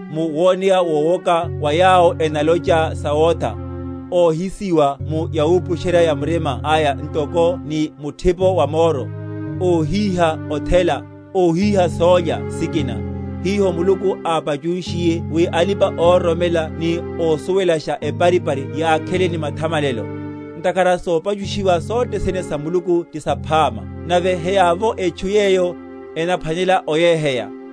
mu woneya wowoka wa yawo enalocha sawotha, óhisiwa mu yawupusherya‐ya‐murima aya ntoko ni muthipo wa moro; óhíha othela, óhíha sólya sikina, hiho Muluku ápachunshiye wi alipa‐ororomela ni ósuwelasha eparipari yakhele ni mathamalelo. Ntakhara sopachushiwa sothene sa Muluku ti saphama, nave heyavovo etchu yeyo, enaphwanela oyeheya,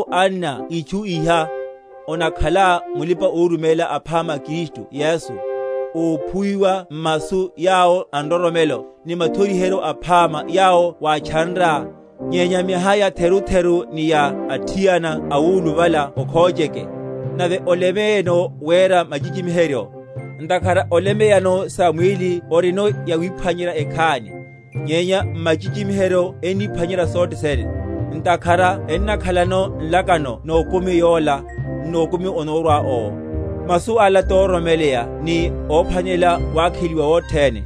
Wawupusheryaru anna itchu iha, onakhalá mulipa‐oruméla aphama a Kristu Yesu, óphuwiwa m’masu yawo a nroromelo, ni mathoriheryo aphama yawo wátchanrá; nyenya miaha yatheru‐theru ni ya athiana awuluvala okhocheke. Nave olemeyeno wera machichimiheryo: Ntakhara olemeyano sa mwíli orino yawiphwanyerya ekhani, nyenya machichimiheryo enniphwanyerya sothe sene. Ntakhara ennakhalano nlakano nokumi yola, n’nokumi onórwa owo. Masu ala tororomeleya ni ophwanelela wakheliwa wothene.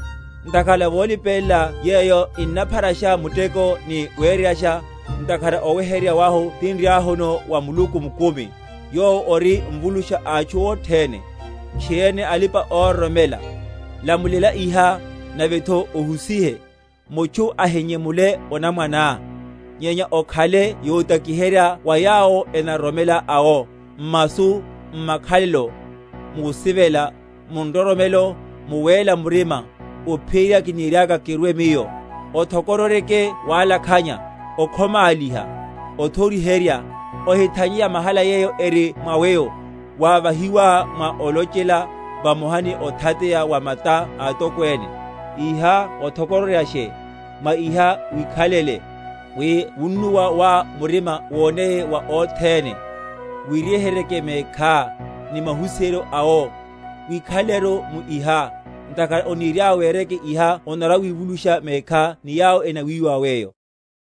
Ntakhara volipelela yeyo ninnapharasha muteko ni wereryasha, ntakhara oweheryerya wahu tinriahuno wa Muluku mukumi, yowo ori Mvulusha a atchu othene, tchiriene a alipa‐ororomela. Lamulela iha, navetho ohusihe. Mutchu ahinyemule onamwaneá; nyenya okhale yotakiherya wa yawo enaroromela awo, m’masu, m’makhalelo, musivela, mu nroromelo, mu wéla murima. Ophiyerya kiniriaka kirwe miyo, othokororyeke walakhanya, okhomáliha, othoriherya. Ohithanye yamahala yeyo eri mwa weyo, wávahiwá mwa olochela, vamoha ni othateya wa mata a atokwene. Iha othokororyashe, mwa iha wikhalele; wi wunnuwa wá murima woneye wa othene. Wiweheryerye mekhá, ni mahusiheryo awo. Wikhalelekeru mu iha; ntakhara oniriá wereke iha onarwa‐wivulusha mekhá ni yawo enawiwa weyo.